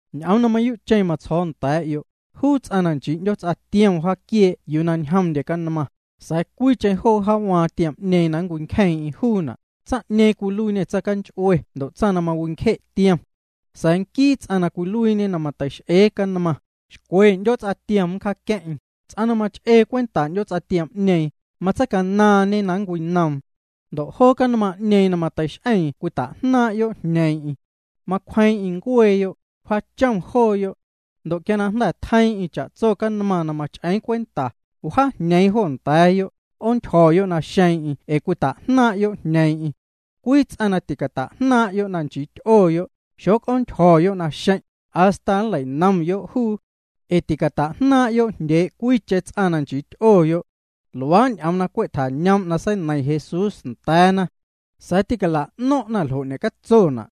’Ñ'oom na mayuu'cheⁿ na matsjo̱o̱ nda̱a̱'yo', juu ts'aⁿ na nchii 'ndyoots'a tiom wjaaquiee' yuu na ñjomndye canmaⁿ, sa̱a̱ cwiicheⁿ joo wjaawaaⁿ juu tiom'ñeeⁿ na nncwincjeeⁿ'eⁿ juuna', tsaⁿ'ñeeⁿ cwiluiiñê tsaⁿcanch'ue ndo' tsaⁿ na mawincje' tiom. Sa̱a̱ nquii ts'aⁿ na cwiluiiñe na mateix'ee canmaⁿ, xcwe 'ndyoots'a tiom nncjaaqueⁿ'eⁿ. Ts'aⁿ na mach'ee cwenta 'ndyoots'a tiom'ñeeⁿ, matseicanaaⁿñe na nncwinoom. Ndo' joo canmaⁿ'ñeeⁿ na mateix'eeⁿ cwita'jnaaⁿ'yo' jñeeⁿ'eⁿ. Macwjeeⁿ'eⁿ ncueeyo', wjaachom jooyo'. Ndo' quia na jnda̱ tjeiiⁿ'eⁿ cha'tso canmaⁿ na mach'eeⁿ cwenta, wjaajñeeⁿ jo nda̱a̱yo', 'oontyjo̱yo' naxeeⁿ'eⁿ ee cwita'jnaaⁿ'yo' jñeeⁿ'eⁿ. Cwii ts'aⁿ na ticata'jnaaⁿ'yo' na nchii ty'oyo', xoc'oontyjo̱yo' naxeⁿ', hasta nlei'nomyo' juu. Ee ticata'jnaaⁿ'yo' jndyee' cwiicheⁿ ts'aⁿ na nchii ty'oyo'. Luaa' ñ'oom na cwe' tjañoom' na seineiⁿ Jesús nda̱a̱na. Sa̱a̱ tîcala'no̱ⁿ'na ljo' ñe'catsona'.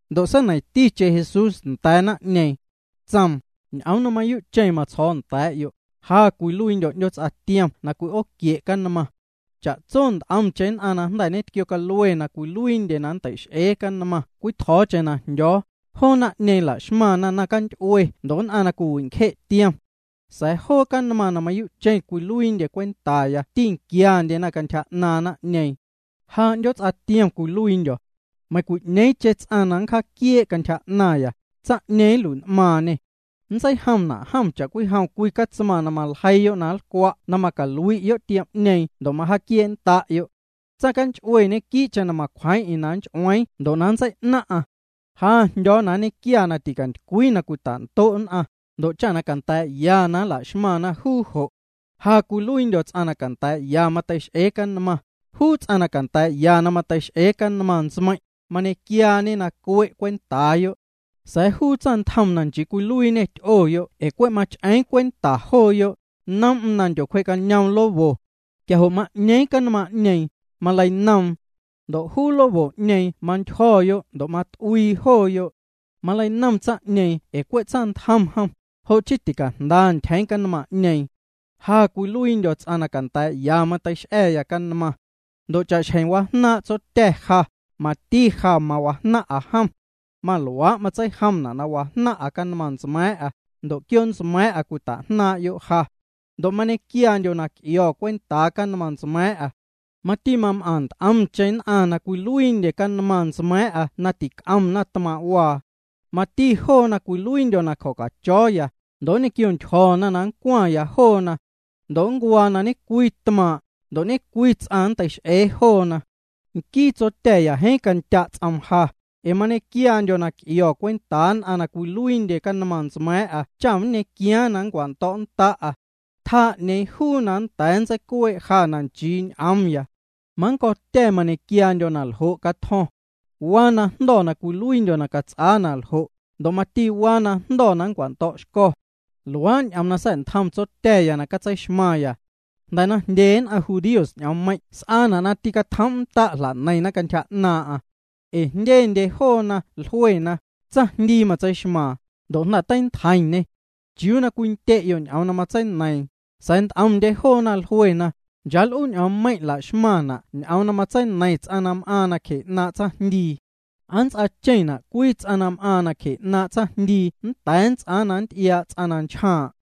Ndo' seineiⁿticheⁿ Jesús nda̱a̱ naⁿ'ñeeⁿ. Tsoom: —Ñ'oom na mayuu'cheⁿ matsjo̱o̱ nda̱a̱'yo', ja cwiluiindyo̱ 'ndyoots'a tiom na cwi'ooquie' canmaⁿ. Cha'tso nt'omcheⁿ nn'aⁿ na jnda̱ tquiocalue na cwiluiindye na nntei'x'ee canmaⁿ cwii tjo̱o̱cheⁿ na jndyo̱o̱, joo naⁿ'ñeeⁿ la'xmaⁿna naⁿcanty'ue ndo' nn'aⁿ na cwiwincje' tiom. Sa̱a̱ joo canmaⁿ na mayuu'cheⁿ cwiluiindye cwentaya tînquiandyena cantyja 'naaⁿ naⁿ'ñeeⁿ. Ja 'ndyoots'a tiom cwiluiindyo̱. Meiⁿcwi'ñeeⁿcheⁿ ts'aⁿ na nncjaaquiee' cantyja 'naⁿya, tsaⁿ'ñeeⁿ nlui'n'maaⁿñê. Nntseijomna' jom cha'cwijom cwii catsmaⁿ na maljeiiyo' na nlcwa' na macalui'yo' tiom'ñeeⁿ ndo' na macwjee'nnda'yo'. ’Tsaⁿcanch'ue ñequii'cheⁿ na macwjeeⁿ'eⁿ na nnch'ueeⁿ nntseicueⁿ'eⁿ ndo' na nntsei'naⁿ'aⁿ. Ja jndyo̱o̱ na nñequia na ticantycwii na cwita'ndo' nn'aⁿ, ndo' cha na canda̱a̱'ya na nla'xmaⁿna juu jo'. Ja cwiluiindyo̱ ts'aⁿ na canda̱a̱'ya mateix'ee canmaⁿ. Juu ts'aⁿ na canda̱a̱'ya na mateix'ee canmaⁿ ntsmeiⁿ', mañequiaañe na cue' cwentaayo'. Sa̱a̱ juu tsaⁿntjom na nchii cwiluiiñê ty'oyo' ee cwe' mach'eeⁿ cwenta jooyo', noom'm na ndyocwjee'cañoom lobo. Quia jo' ma'ñeeⁿ canmaⁿ'ñeeⁿ, maleinoom. Ndo' juu lobo'ñeeⁿ mantyjo̱ ndo' mat'uii jooyo'. Maleinom tsaⁿ'ñeeⁿ ee cwe' tsaⁿntjom jom, jo' chii ticajnda ntyjeeⁿ canmaⁿ'ñeeⁿ. ’Ja cwiluiindyo̱ ts'aⁿ na canda̱a̱'ya mateix'a̱ya canmaⁿ. Ndo' cha'xjeⁿ wajnaaⁿ' Tsotya̱ ja, mati ja mawajnaⁿ'a jom. Maluaa' matseijomna' na wajnaⁿ'a canmaⁿ ntsma̱a̱ⁿ'a, ndo' quioo' ntsma̱a̱ⁿ'a cwitajnaaⁿ'yo' ja. Ndo' mañequiaandyo̱ na c'io̱ cwentaa canmaⁿ ntsma̱a̱ⁿ'a. Mati mam'aⁿ nt'omcheⁿ nn'aⁿ na cwiluiindyena canmaⁿ ntsma̱a̱ⁿ'a na tic'omna tmaaⁿ'waa. Mati joona cwiluiindyo̱ na cjo̱cacho̱o̱ya, ndo' nnquiontyjo̱na na nncwaⁿya joona. Ndo' nncuaa na ñe'cwii tmaaⁿ', ndo' ñe'cwii ts'aⁿ na nnteix'ee joona. ’Nquii Tsotya̱ jeeⁿ candya' ts'oom ja, ee mañequiaandyo̱ na c'io̱ cwentaa nn'aⁿ na cwiluiindye canmaⁿ ntsma̱a̱ⁿ'a cha nñequiaaⁿ na nncwando̱'nnda'a. Tjaa'naⁿ 'ñeeⁿ juu na nnda̱a̱ nntseicuee' ja na nchii ñ'oomya. Mannco̱tya̱ mañequiaandyo̱ na ljo' catjo̱ⁿ. Waa najndo̱ na cwiluiindyo̱ na cats'aa na ljo', ndo' mati waa na jndo̱ na nncwando̱'xco̱. Luaa' ñ'oom na sa̱'ntjom Tsotya̱ya na catseixmaⁿya. Jnda̱ na jndye nn'aⁿ judíos ñ'oommeiⁿ' s'aana' na tîcatjoom'nnda' na jla'neiⁿna cantyja 'naaⁿ'aⁿ. Ee jndyendye joona jluena: —Tsaⁿjndii matseixmaaⁿ, ndo' jnda̱ teintjeiⁿñê. ¿Chiuu na cwindye'yo' ñ'oom na matseineiiⁿ? Sa̱a̱ nt'omndye joona jlue: —Nchaa l'uu ñ'oommeiⁿ' la'xmaⁿna' ñ'oom na nntseineiⁿ ts'aⁿ na m'aaⁿ nacje 'naaⁿ' tsaⁿjndii. ¿Aa nnts'aacheⁿna' cwii ts'aⁿ na m'aaⁿ nacje 'naaⁿ' tsaⁿjndii nnda̱a̱ nnts'aa na nnty'iaa' ts'aⁿ na nchjaaⁿ'?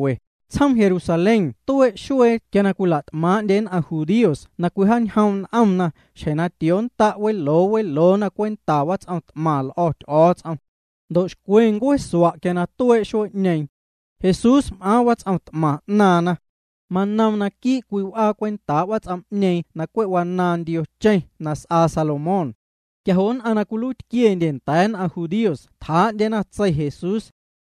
Tsjoom Jerusalén tuee' xuee quia cwila't'maaⁿ'ndye nn'aⁿ judíos na cwijaañjoom' n'omna xjeⁿ na tiooxconnda' weloo weloona cwenta wats'om t'maⁿ l'o̱ Ty'o̱o̱ts'om. Ndo' xcwe ncueesua' quia tuee' xuee'ñeeⁿ. Jesús m'aaⁿ wats'om t'maⁿ 'naaⁿna. Manoom naquii' cwii w'aa cwentaa' wats'om'ñeeⁿ na cwe' wanaaⁿ ndiocheⁿ na s'aa Salomón. Quia jo' nn'aⁿ na cwiluiitquiendye nda̱a̱ nn'aⁿ judíos tjaa'ndyena tsei Jesús.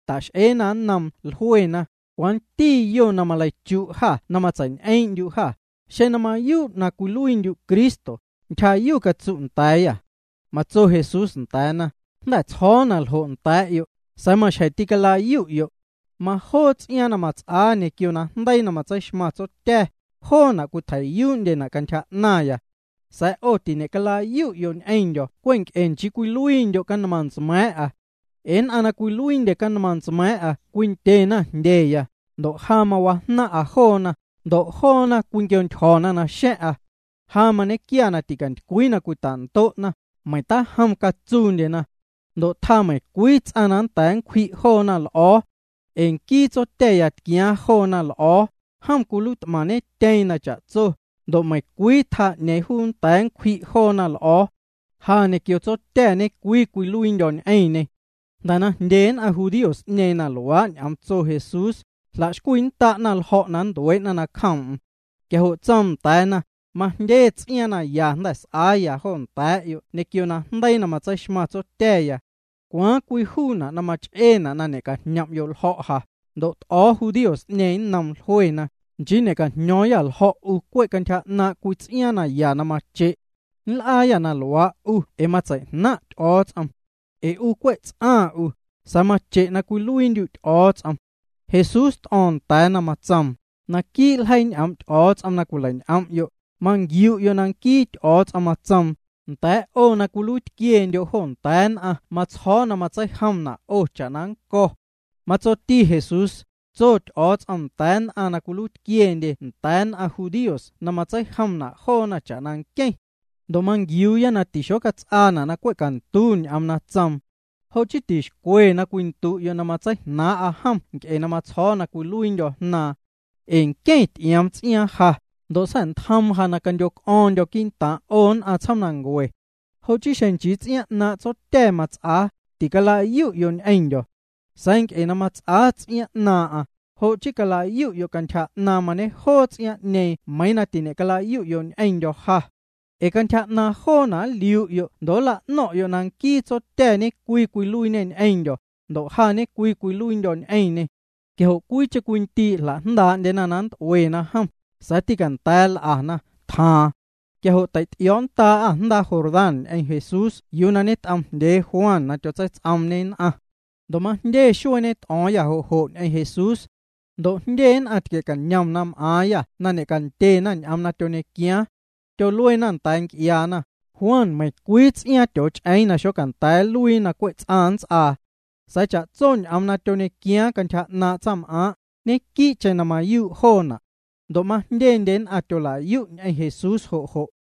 Ta'x'eena nnoom jluena: —¿Cwanti yo na maleichu' jâ na matseiñ'eeⁿ'ndyu' jâ? Xeⁿ na mayuu' cwiluiindyu' Cristo, ntyjayu catsu' nda̱a̱yâ. Matso Jesús nda̱a̱na: —Jnda̱ tsjo̱o̱ na ljo' nda̱a̱'yo', sa̱a̱ maxjeⁿ tîcalayu'yo'. Majoo ts'iaaⁿ na mats'aa ñequio najndeii na matseixmaⁿ Tsotya̱, joona' cwitjei'yuu'ndyena' cantyja 'naⁿya. Sa̱a̱ 'o tiñe'calayu'yo' ñ'eⁿndyo̱ cwe' nc'e nchii cwiluiindyo' canmaⁿ ntsma̱a̱ⁿ'a. Ee nn'aⁿ na cwiluiindye canmaⁿ ntsma̱a̱ⁿ'a cwindyena jndyeya, ndo' ja mawajnaⁿ'a joona, ndo' joona cwinquiontyjo̱na naxa̱ⁿ'a. Ja mañequia na ticantycwii na cwita'ndo'na, meiⁿ tajom catsuundyena. Ndo' tjaa meiⁿcwii ts'aⁿ na nnda̱a̱ nncwji' joona l'o̱o̱. Ee nquii Tsotya̱ na tquiaaⁿ joona l'o̱o̱, jom cwiluiit'maⁿñetyeeⁿ na cha'tso, ndo' meiⁿcwii tjaa 'ñeeⁿ juu nnda̱a̱ nncwji' joona l'o̱o̱ⁿ. Ja ñequio Tsotya̱ ñe'cwii cwiluiindyo̱ ñ'eⁿñê. Jnda̱ na jndye nn'aⁿ judíos'ñeeⁿ na luaa' ñ'oom tso Jesús, jla'xcwiinnda'na ljo̱' na nntuee'na nacjoom'm. Quia jo' tsoom nda̱a̱na: —Majndye ts'iaaⁿ na ya jnda̱ s'aaya jo nda̱a̱'yo' ñequio najndeii na matseixmaⁿ Tsotya̱ya. ¿Cwaaⁿ cwii juuna' na mach'eena' na ñe'cajñom'yo' ljo̱' ja? Ndo' t'o̱o̱ judíos'ñeeⁿ nnoom, jluena: —Nchii ñe'cajño̱o̱ⁿyâ ljo̱' 'u cwe' cwii ts'iaaⁿ na ya mache'. Nl'aayâ na luaa' 'u ee matsei'jnaⁿ' Ty'o̱o̱ts'om. Ee 'u cwe' ts'aⁿ 'u, sa̱a̱ mache' na cwiluiindyu' Ty'o̱o̱ts'om. Jesús t'o̱o̱ⁿ nda̱a̱na, tsoom: —Naquii' ljeii ñ'oom' Ty'o̱o̱ts'om na cwileiñ'om'yo', manquiu'yo' na nquii Ty'o̱o̱ts'om matsoom: “Nda̱a̱' 'o na cwiluiitquiendyo' jo nda̱a̱ nn'aⁿ matsjo̱o̱ na matseijomna' 'o cha'na nnco̱.” Matsoticheⁿ Jesús: —Tso Ty'o̱o̱ts'om nda̱a̱ nn'aⁿ na cwiluiitquiendye nda̱a̱ nn'aⁿ judíos na matseijomna' joona cha'na nqueⁿ. Ndo' manquiuuya na tixocats'aana' na cwe' cantu ñ'oom na tsoom. Jo' chii tixcwe na cwindu'yo' na matseijnaaⁿ'a jom nc'e na tsjo̱o̱ na cwiluiindyo̱ Jnaaⁿ. Ee nqueⁿ ty'ioom ts'iaaⁿ ja, ndo' sa̱'ntjoom ja na candyoc'o̱o̱ⁿndyo̱ quii'ntaaⁿ' 'o nn'aⁿ tsjoomnancue. Jo' chii xeⁿ nchii ts'iaaⁿ 'naaⁿ' Tsotya̱ mats'aa, ticalayu'yo' ñ'eⁿndyo̱. Sa̱a̱ nc'e na mats'aa ts'iaaⁿ 'naaⁿ'aⁿ, jo' chii calayu'yo' cantyja 'naaⁿ mañejoo ts'iaaⁿ'ñeeⁿ meiiⁿ na tiñe'calayu'yo' ñ'eⁿndyo̱ ja. Ee cantyja 'naaⁿ joona' nliu'yo' ndo' nla'no̱ⁿ'yo' na nquii Tsotya̱ ñe'cwii cwiluiiñê ñ'eⁿndyo̱, ndo' ja ñe'cwii cwiluiindyo̱ ñ'eⁿñê. Quia jo' cwiicheⁿ cwii ndii' jla'jndaa'ndyena na nnt'uena jom, sa̱a̱ tîcanda̱a̱ l'ana, tjaaⁿ. Quia jo' tei'ty'io̱o̱nndaa'â jndaa Jordán ñ'eⁿ Jesús yuu ñet'oomjndyee Juan na tyotseits'oomñê nn'aⁿ. Ndo' majndye xuee ñet'o̱o̱ⁿyâ jo' jo' ñ'eⁿ Jesús. Ndo' jndye nn'aⁿ tquie'cañom na m'aaⁿyâ na ñe'candyena ñ'oom na tyoñequiaaⁿ. Tyoluena nda̱a̱ nc'iaana: —Juan meiⁿcwii ts'iaaⁿ tyooch'eeⁿ na xocanda̱a̱ nluiina' na cwe' ts'aⁿ nnts'aa. Sa̱a̱ cha'tso ñ'oom na tyoñequiaaⁿ cantyja 'naaⁿ' tsaⁿm'aaⁿ', ñequii'cheⁿ na mayuu' joona'. Ndo' majndye nn'aⁿ tyola'yu' ñ'eⁿ Jesús jo' jo'.